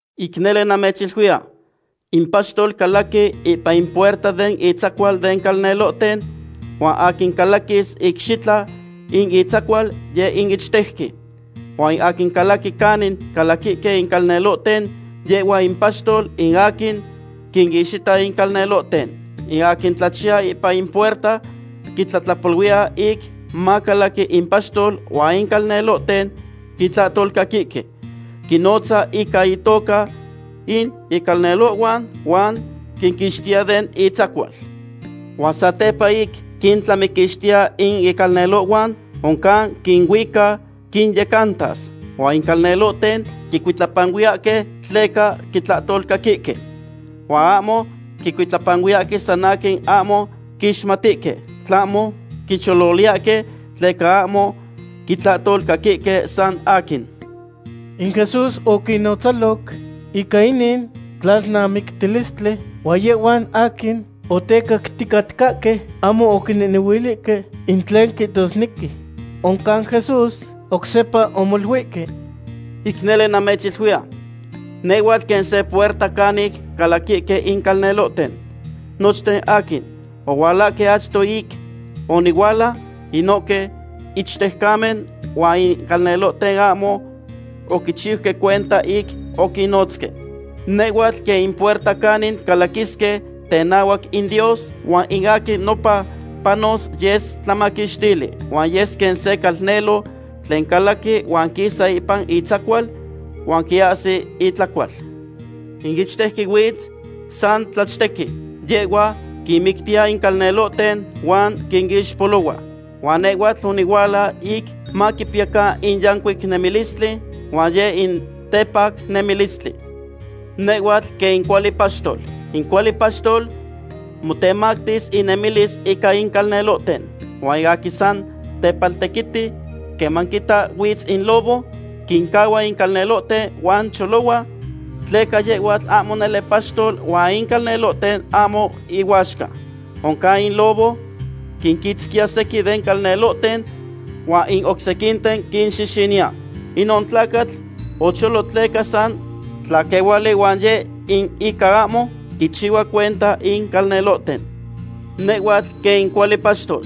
’Ic nele namechiluiya, in paxtol calaqui ipan in puerta den itzacual den calnelohten, huan aquin calaquis icxitla in itzacual, yeh in ichtejqui. Huan in aquin calaqui canin calaquihque in calnelohten, yehhua in paxtol, in aquin quinixpiya in calnelohten. In aquin tlachiya ipan in puerta quitlatlapoluiya ic macalaqui in paxtol, huan in calnelohten quitlahtolcaquihque. Quinnotza ica intoca in icalnelohhuan, huan quinquixtiya den intzacual. Huan satepa ic quintlamiquixtiya in icalnelohhuan, oncan quinuica quinyecantas. Huan in calnelohten quicuitlapanuiyahque, tleca quitlahtolcaquihque. Huan ahmo quicuitlapanuiyahque san aquin ahmo quixmatihque, tlahmo quichololiyahque, tleca ahmo quitlahtolcaquihque san aquin. In Jesús oquinnonotzaloc ica inin tlalnamictilistli, huan yehhuan aquin otecacticatcahque ahmo oquinehnehuilihque in tlen quihtosnequi. Oncan Jesús oc sepa omoluihque: ―Ic nele namechiluiya, nehhuatl quen se puerta canic calaquihque in calnelohten. Nochten aquin ohualahque achto ic onihuala, inohque ichtejcamen, huan in calnelohten ahmo oquinchiuque cuenta ic oquinnotzque. Nehhuatl quen in puerta canin calaquisque tenahuac in Dios, huan in aquin nopa panos yes tlamaquixtili. Huan yes quen se calnelo tlen calaqui huan quisa ipan intzacual huan quiahsi itlacual. ’In ichtejqui huitz san tlachtequi. Yehhua quinmictiya in calnelohten huan quinixpolohua. Huan nehhuatl onihuala ic maquipiyacan in yancuic nemilistli, huan yeh in tepac nemilistli. Nehhuatl quen in cuali paxtol. In cuali paxtol motemactis inemilis ica in calnelohten. Huan in aquin san tepaltequiti, queman quita huitz in lobo, quincahua in calnelohten huan cholohua, tleca yehhuatl ahmo nele paxtol huan in calnelohten ahmo ihuaxca. Oncan in lobo quinquitzquiya sequin den calnelohten huan in oc sequinten quinxixiniya. Inon tlacatl ocholo tleca san tlaquehuali huan yeh in ica ahmo quinchihua cuenta in calnelohten. ’Nehhuatl quen in cuali paxtol.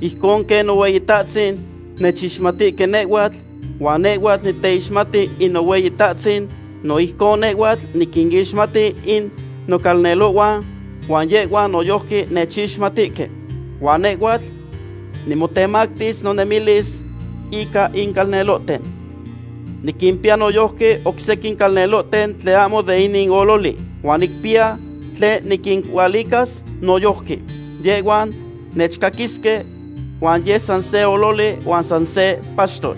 Ijcon quen Nohueyitahtzin nechixmatihque nehhuatl, huan nehhuatl niteixmati in Nohueyitahtzin, no ijcon nehhuatl niquinixmati in nocalnelohhuan, huan yehhuan noyojqui nechixmatihque. Huan nehhuatl nimotemactis nonemilis ica in calnelohten. Niquimpiya noyojqui oc sequin calnelohten tlen ahmo de inin ololi, huan nicpiya tlen niquinualicas noyojqui. Yehhuan nechcaquisque, huan yes san se ololi huan san se paxtol.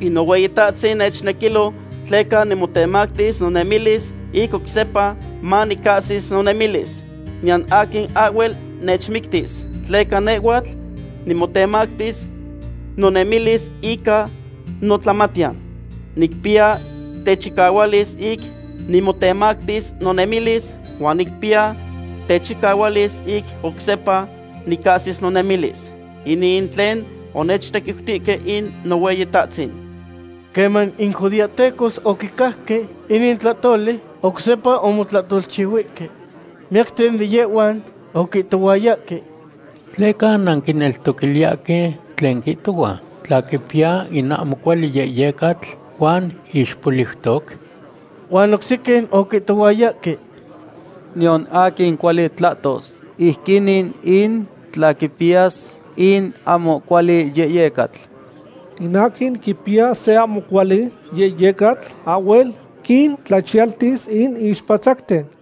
’In Nohueyitahtzin nechnequilo tleca nimotemactis nonemilis ic oc sepa manicahsis nonemilis. Niyan aquin ahhuel nechmictis, tleca nehhuatl nimotemactis nonemilis ica notlamatiyan. Nicpiya techicahualis ic nimotemactis nonemilis, huan nicpiya techicahualis ic oc sepa nicahsis nonemilis. Inin in tlen onechtequiutihque in Nohueyitahtzin. Queman in judeahtecos oquicajque inin tlahtoli, oc sepa omotlahtolchihuihque. Miyacten de yehhuan oquihtohuayahque: ―¿Tleca nanquineltoquiliyahque tlen quihtohua, tla quipiya in ahmo cuali yehyecatl huan ixpoliutoc? Huan oc sequin oquihtohuayahque: ―Niyan aquin cuali tlahtos ijquinin in tla quipiyas in ahmo cuali yehyecatl. In aquin quipiya se ahmo cuali yehyecatl ahhuel quintlachiyaltis in ixpatzacten.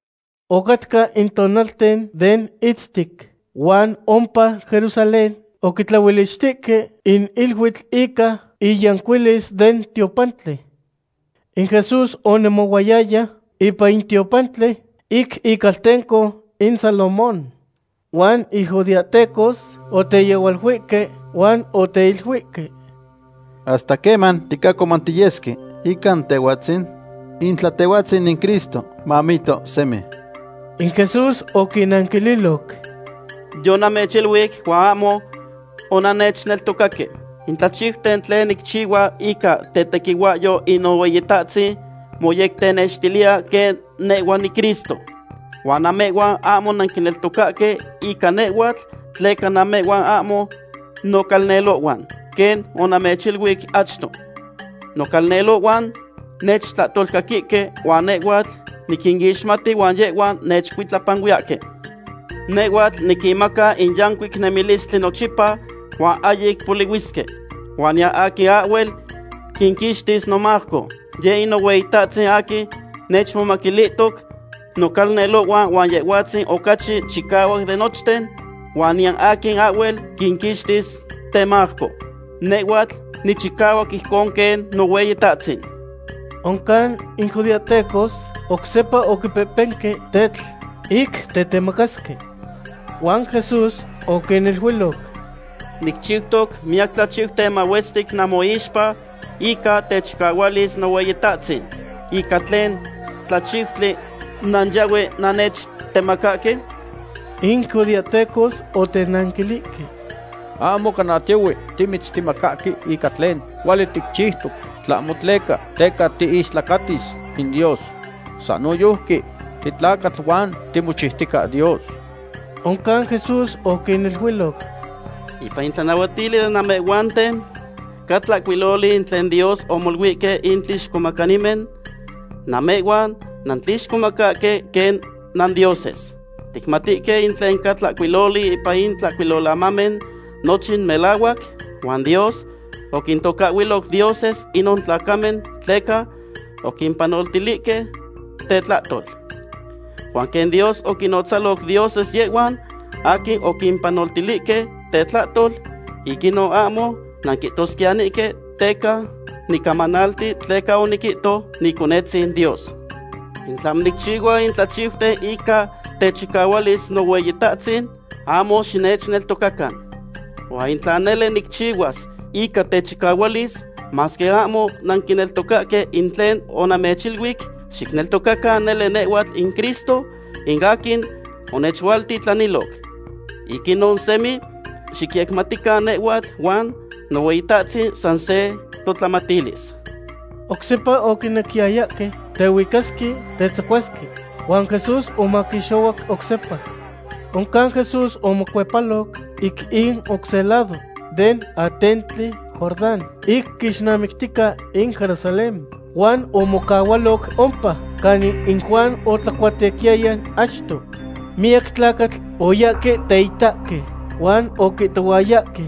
Ocatca in tonalten den itztic, huan ompa Jerusalén oquitlaolichtihque in iluitl ica iyancuilis den tiopantli. In Jesús onemohuayaya ipan in tiopantli ic Icaltenco in Salomón. Huan in judeahtecos oteyehualuihque huan oteiluihque: ―¿Hasta queman ticahcomantiyesque ica Tehhuatzin? In tla Tehhuatzin in Cristo, mamihto semi. In Jesús oquinanquililoc: ―Yonamechiluic huan ahmo onannechneltocaque. In tlachiuten tlen nicchihua ica tetequihuahyo in Nohueyitahtzin moyectenextiliya quen nehhua niCristo. Huan namehhuan ahmo nanquineltocahque ica nehhuatl tleca namehhuan ahmo nocalnelohhuan, quen onamechiluic achto. Nocalnelohhuan nechtlahtolcaquihque, huan nehhuatl niquinixmati huan yehhuan nechcuitlapanuiyahque. Nehhuatl niquinmaca in yancuic nemilistli nochipa, huan ahyic polihuisque. Huan niyan aquin ahhuel quinquixtis nomajco. Yeh in Nohueyitahtzin aquin nechmomaquilihtoc nocalnelohhuan huan Yehhuatzin ocachi chicahuac de nochten, huan niyan aquin ahhuel quinquixtis temajco. Nehhuatl nichicahuac ijcon quen Nohueyitahtzin. Oncan in judeahtecos oc sepa oquipehpenque tetl ic tetemacasque. Huan Jesús oquiniluiloc: ―Nicchiutoc miyac tlachiuten mahuestic nanmoixpa ica techicahualis Nohueyitahtzin. ¿Ica tlen tlachiutli nanyahue nannechtemacahque? In judeahtecos otenanquilihque: ―Ahmo cana tiohue timitztemacahque ica tlen cuali ticchiutoc, tlahmo tleca teca tiistlacatis in Dios. San noyojqui titlacatl, huan timochiutica Dios. Oncan Jesús oquiniluiloc: ―Ipan in tlanahuatili den namehhuanten ca tlahcuiloli in tlen Dios omoluihque in tlixcomacanimen: “Namehhuan nanquinixcomacahque quen nandioses.” Ticmatihque in tlen ca tlahcuiloli ipan in Tlahcuilolamamen nochin melahuac, huan Dios oquintocahhuiloc dioses inon tlacamen tleca oquimpanoltilihque tetlahtol. Huan quen Dios oquinnotzalo dioses yehhuan aquin oquimpanoltilihque tetlahtol, ic inon ahmo nanquihtosquiyanihque teca nicamanalti tleca oniquihto Niconetzin Dios. In tlahmo nicchihua in tlachiuten ica techicahualis Nohueyitahtzin, ahmo xinechneltocacan. Huan in tla nele nicchihuas ica techicahualis, masque ahmo nanquineltocahque in tlen onamechiluic, xicneltocacan nele nehhuatl in Cristo, in aquin onechualtitlaniloc. Ic inon semi xicyecmatican nehhuatl huan Nohueyitahtzin san se totlamatilis. Oc sepa oquinequiyayahque tehuicasque tetzacuasque, huan Jesús omaquixohuac oc sepa. Oncan Jesús omocuepaloc ic in oc se lado den atentli Jordán ic quixnamictica in Jerusalén huan omocahualoc ompa, canin in Juan otlacuatequiyaya achto. Miyac tlacatl oyahque teitahque, huan oquihtohuayahque: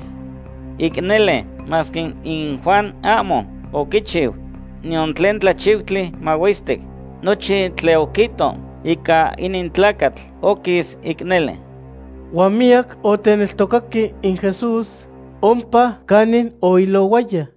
―Ic nele, masque in Juan ahmo oquichiu niyan tlen tlachiutli mahuestic, nochin tlen oquihto ica inin tlacatl oquis ic nele. Huan miyac oteneltocaque in Jesús ompa canin oilohuaya.